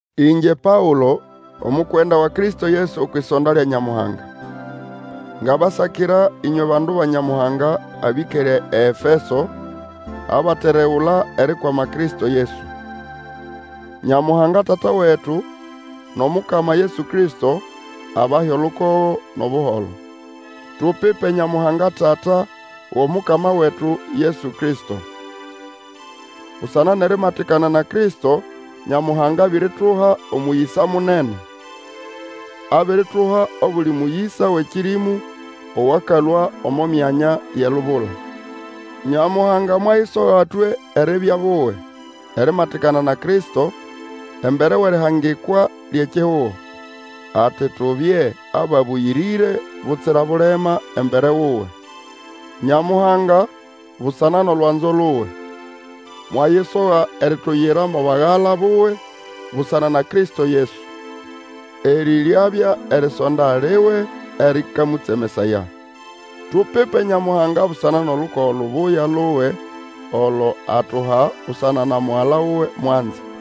Ingye Paũlo, omukwenda wa Kristo Yesu okwʼisonda lya Nyamuhanga. Ngabasakira ĩnywe bandu ba Nyamuhanga abĩkere eEfeso, abateregula erikwama Kristo Yesu. Nyamuhanga Tata wetu, nʼomukama Yesu Kristo, abahe olukogo nʼobuholo. Tupipe Nyamuhanga Tata wʼOmukama wetu Yesu Kristo! Busana nʼerimatikana na Kristo Nyamuhanga abirituha omũyĩsa munene. Abirituha obuli mũyĩsa wʼekĩrĩmũ owakalũa omo myanya yʼelubula. Nyamuhanga mwayisoga twe eribya buwe, erimatikana na Kristo embere wʼerihangikwa lyʼekihugo, ati tubye ababũyĩrĩre butsira bulema embere wuwe. Nyamuhanga, busana nʼolwanzo luwe, mwayisoga erituyira mo bagala buwe busana na Kristo Yesu. Erĩ ryabya erisonda liwe erĩkamũtsemesaya. Tupipe Nyamuhanga busana nʼolukogo lubuya luwe olo atuha busana na Mugala wuwe mwanze!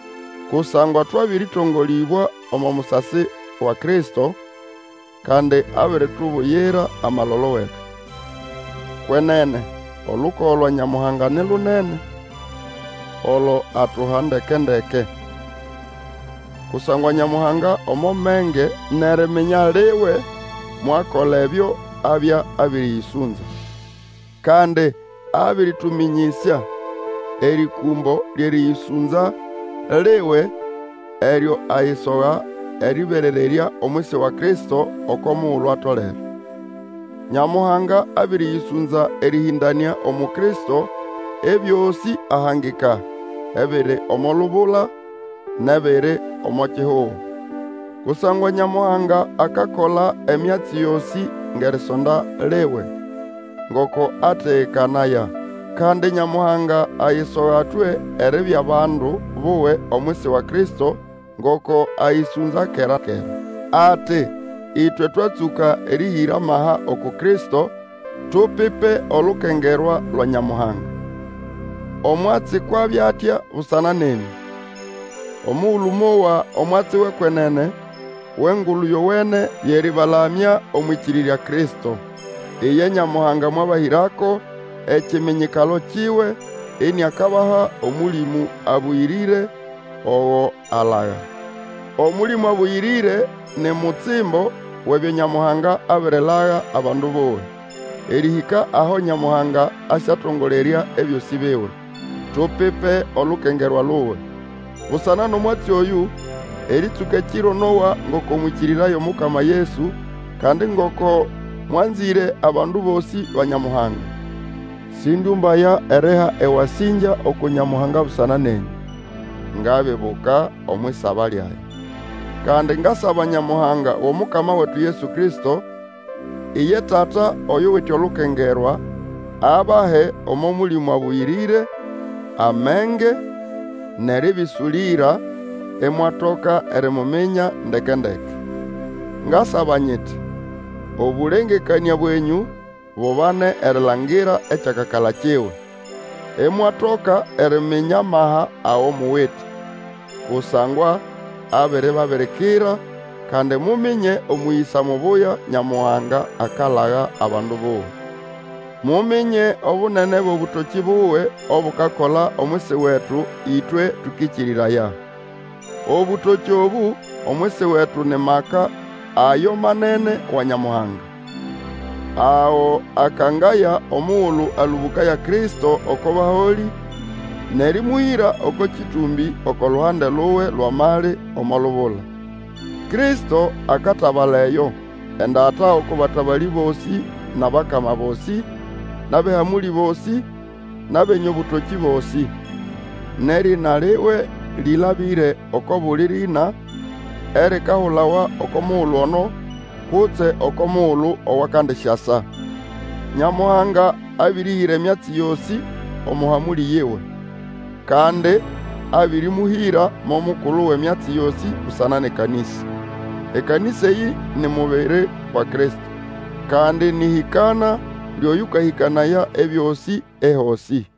Kusangwa twabĩrĩtongolĩbwa omo musasi wa Kristo, kandi abiritubuyira amalolo wetu. Kwenene olukogo lwa Nyamuhanga ni lunene, olo atuha ndeke-ndeke. Kusangwa Nyamuhanga omo menge nʼeriminya liwe mwakola ebyo abya abĩrĩyĩsũnza. Kandi abĩrĩtũmĩnyĩsya erĩkũmbo lyʼerĩyĩsũnza liwe, eryo ayisoha erĩberererya omwisi wa Kristo oko mugulu atolere. Nyamuhanga abĩrĩyĩsũnza erĩhĩndanĩa umu Kristo ebyosĩ ahangika, ebiri omo lubula nʼebiri omo kihugo. Kusangwa Nyamuhanga akakola emyatsi yosĩ ngʼerisonda liwe, ngoko ategekanaya. Kandi Nyamuhanga ayisoga twe eribya bandu buwe omwisi wa Kristo ngoko ayĩsũnza kera-kera. Ati, ĩtwe twatsũka erĩhĩra amaha uku Kristo, tupipe olukengerwa lwa Nyamuhanga. Omwatsi kwʼabya atya busana nenyũ. Omugulu mowa omwatsi wʼekwenene, wʼEngulu Yowene yʼerĩbalamya omwʼĩkĩrĩrya Kristo. Iye Nyamuhanga mwabahĩrako ekiminyikalo kiwe, iniakabaha Omũlĩmũ Abũyĩrĩre ogo alaga. Omũlĩmũ Abũyĩrĩre ni mutsimbo wʼebyo Nyamuhanga abirilaga abandu buwe, erĩhĩka aho Nyamuhanga asyatongolerya ebyosĩ biwe. Tupipe olukengerwa luwe! Busana nʼomwatsi oyũ, erĩtsũka ekiro nowa ngoko mwĩkĩrĩraya Omukama Yesu, kandi ngoko mwanzĩre abandu bosĩ ba Nyamuhanga. Sĩndyũmbaya eriha ewasĩngya uku Nyamuhanga busana nenyũ. Ngabibuka omwʼisaba lyage. Kandi ngasaba Nyamuhanga wʼOmukama wetu Yesu Kristo, iye Tata oyuwite olukengerwa, abahe omo Mũlĩmũ Abũyĩrĩre, amenge, nʼerĩbĩsũlĩra, imwatoka erimuminya ndeke-ndeke. Ngasaba nyiti, obũlengekanĩa bwenyũ bubane erilangira ekyakakala kiwe, imwatoka eriminya amaha ago muwite, kusangwa abiribabirikira, kandi muminye omũyĩsa mubuya Nyamuhanga akalaga abandu buwe. Muminye obunene bwʼobũtokĩ buwe obukakola omwisi wetu ĩtwe tũkĩkĩrĩraya. Obũtokĩ obũ omwisi wetu ni maka ayo manene wa Nyamuhanga, ago akangaya omugulu alũbũkaya Kristo oko baholĩ, nʼerĩmũhĩra oko kĩtũmbĩ oko luhande luwe lwʼamali omo lubula. Kristo akatabala eyo, endata oko batabalĩ bosĩ nʼabakama bosĩ, nʼabʼehamũlĩ bosĩ, nʼabenye obũtokĩ bosĩ. Nʼerĩna liwe lĩlabĩre oko buli rĩna erikahulawa oko mugulu ono, kutse oko mugulu owakandisyasa. Nyamuhanga abĩrĩhĩra emyatsi yosĩ omo hamũlĩ yiwe, kandi abĩrĩmũhĩra mo mukulu wʼemyatsi yosĩ busana nʼekanĩsa. Ekanĩsa eyĩ ni mubiri wa Kristo, kandi nĩ ʼhĩkana lyʼoyũkahĩkanaya ebyosĩ ehosĩ.